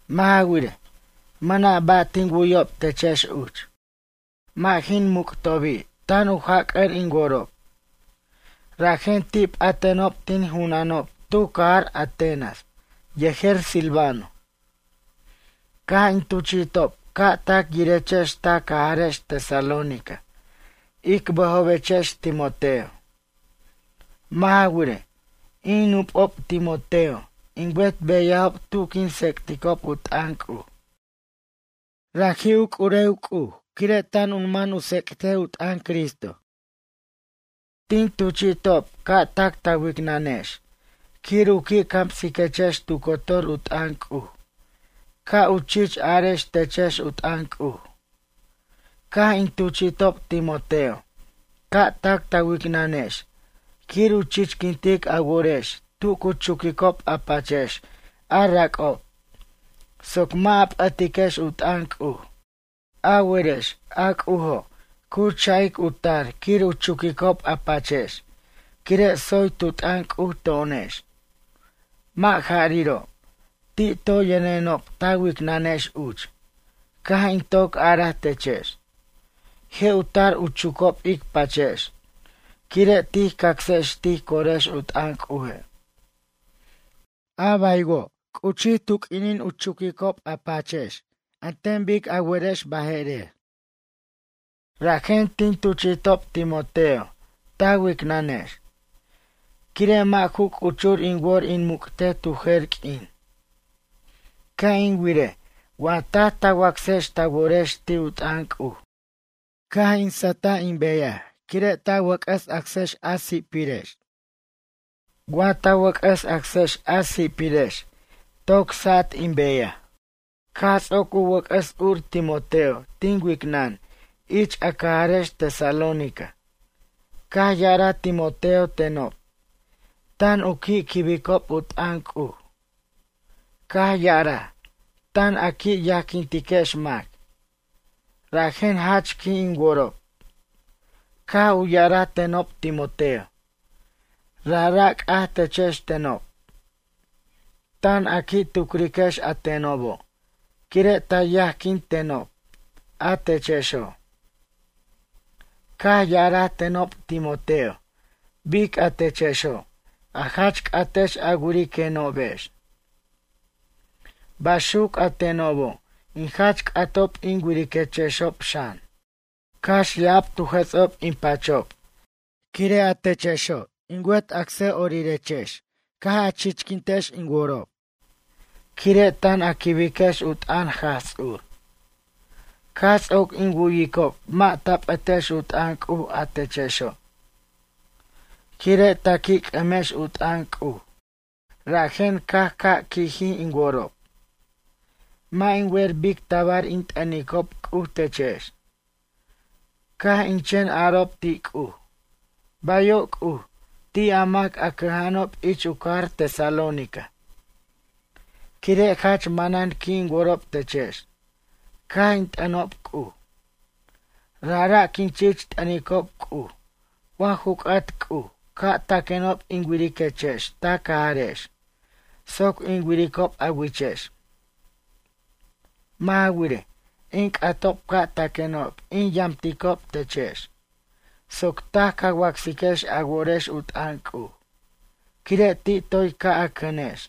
Mʌ' ja wirej, mʌna' ba' tin wu'yob techex uch. Mʌ' jin muc'obi' tan u jac'ʌr in worob. Rajen ti' p'atenob tin junanob tu cajar Atenas yejer Silvano. Caj in tuchi'tob ca' tac yirechex ta cajarex Tesalónica ic bʌjobechex Timoteo. Mʌ' ja wirej, in nup'ob Timoteo in wet beyajob tu quin tsec'ticob u t'ʌn C'uj. Raji' u c'urew C'uj quire' tan u man u tsec't u t'ʌn Cristo. Tin tuchi'tob ca' tac ta wicnʌnex quir u qui' camsiquechex tu cotor u t'ʌn C'uj ca' u chich arex techex u t'ʌn C'uj. Caj in tuchi'tob Timoteo ca' tac ta wicnʌnex quir u chichquintic a worex tu cu chuquicob a pachex a rac'ob soc mʌ' a p'ʌtiquex u t'ʌn C'uj. A werex a C'ujo' cu cha'ic u tar quir u chucob a pachex quire' tsoy tu t'ʌn C'uj to'onex. Mʌ' jariro', ti' toy yʌnenob ta wicnʌnex uch. Caj in toc araj techex: Je' u tar u chucob ic pachex quire' tij cacsex tij corex u t'ʌn C'uje'. A baywo', c'uchij tu q'uinin u chucob a pachex an ten bic a werex baje'rer. Rajen tin tuchi'tob Timoteo ta wicnʌnex. Quire' mʌ' ju c'uchur in wor in muc'tej tu jer q'uin. Ca' in wirej wa taj ta wacsex ta worex ti' u t'ʌn C'uj. Caj in sʌjtaj in beyaj quire' ta wʌc'ʌs acsex a si'pirex. Wa ta wʌc'ʌs acsex a si'pirex toc sat in beyaj. Caj ts'oc u wʌc'ʌs ur Timoteo tin wicnʌn ich a cajarex Tesalónica. Caj ya'araj Timoteo tenob, tan u qui' quibicob u t'ʌn C'uj. Caj ya'araj, tan a qui' yajquintiquex mac, rajen jach qui' in worob. Caj u ya'araj tenob Timoteo, rajra' c'aj techex tenob. Tan a qui' tucriquex a tenobo' quire' ta yajquint tenob a techexo'. Caj ya'araj tenob Timoteo bic a techexo' a jach c'atex a wiriquenobex. Baxuc a tenobo', in jach c'atob in wiriquechexob xan. Cax ya'ab tu jʌts'ob in pachob cax, quire' a techexo' in wet acsʌ'orirex caj a chichquintex in worob. Quire' tan a quibiquex u t'ʌn Jaj Ts'ur. Caj ts'oc in wu'yicob mʌ' ta p'ʌtex u t'ʌn C'uj, a techexo'. Quire' ta qui' c'ʌmex u t'ʌn C'uj rajen caj ca' qui'jij in worob. Mʌ' in wer bic tabar in t'ʌnicob C'uj techex. Caj in chen arob ti' C'uj: “Bayo' C'uj ti' a mac a cʌja'anob ich u cajar Tesalónica.” Quire' jach manan qui' in worob techex caj in t'ʌnob C'uj. Rajra' quin chich t'ʌnicob C'uj wa ju c'at C'uj ca' taquenob in wiriquechex ta cajarex soc in wiricob a wichex. Mʌ' ja wirej, in c'atob ca' taquenob in yamticob techex soc taj ca wacsiquex a worex u t'ʌn C'uj, quire' ti' toy ca' a cʌnex.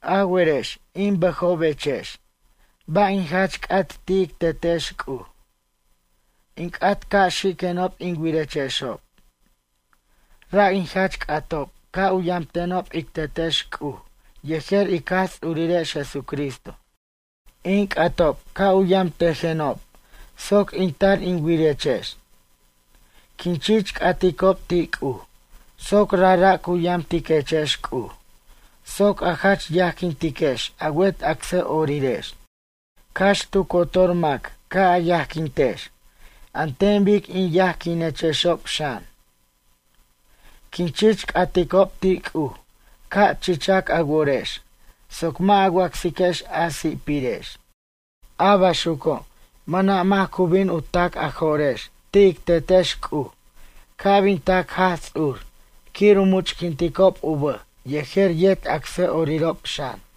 A werex in bʌjobechex ba' in jach c'at ti' ic Tetex C'uj? In c'at ca' xiquenob in wirechexob. Ra' in jach c'atob ca' u yamtenob ic Tetex C'uj yejer ic Jaj Ts'urirex Jesucristo. In c'atob ca' u yamtejenob soc in tar in wirechex. Quin chich c'aticob ti' C'uj soc rajra' cu yamtiquechex C'uj soc a jach yajquintiquex a wet acsʌ'orirex. Cax tu cotor mac ca' a yajquintex an ten bic in yajquinechexob xan. Quin chich c'aticob ti' C'uj ca' chichac a worex soc mʌ' a wacsiquechex a si'pirex. A baxuco' mʌna' mac cu bin u ta'c a jo'rex ti' ic Tetex C'uj ca' bin tac Jaj Ts'ur quir u much'quinticob u bʌj yejer yet acsʌ'orirob xan.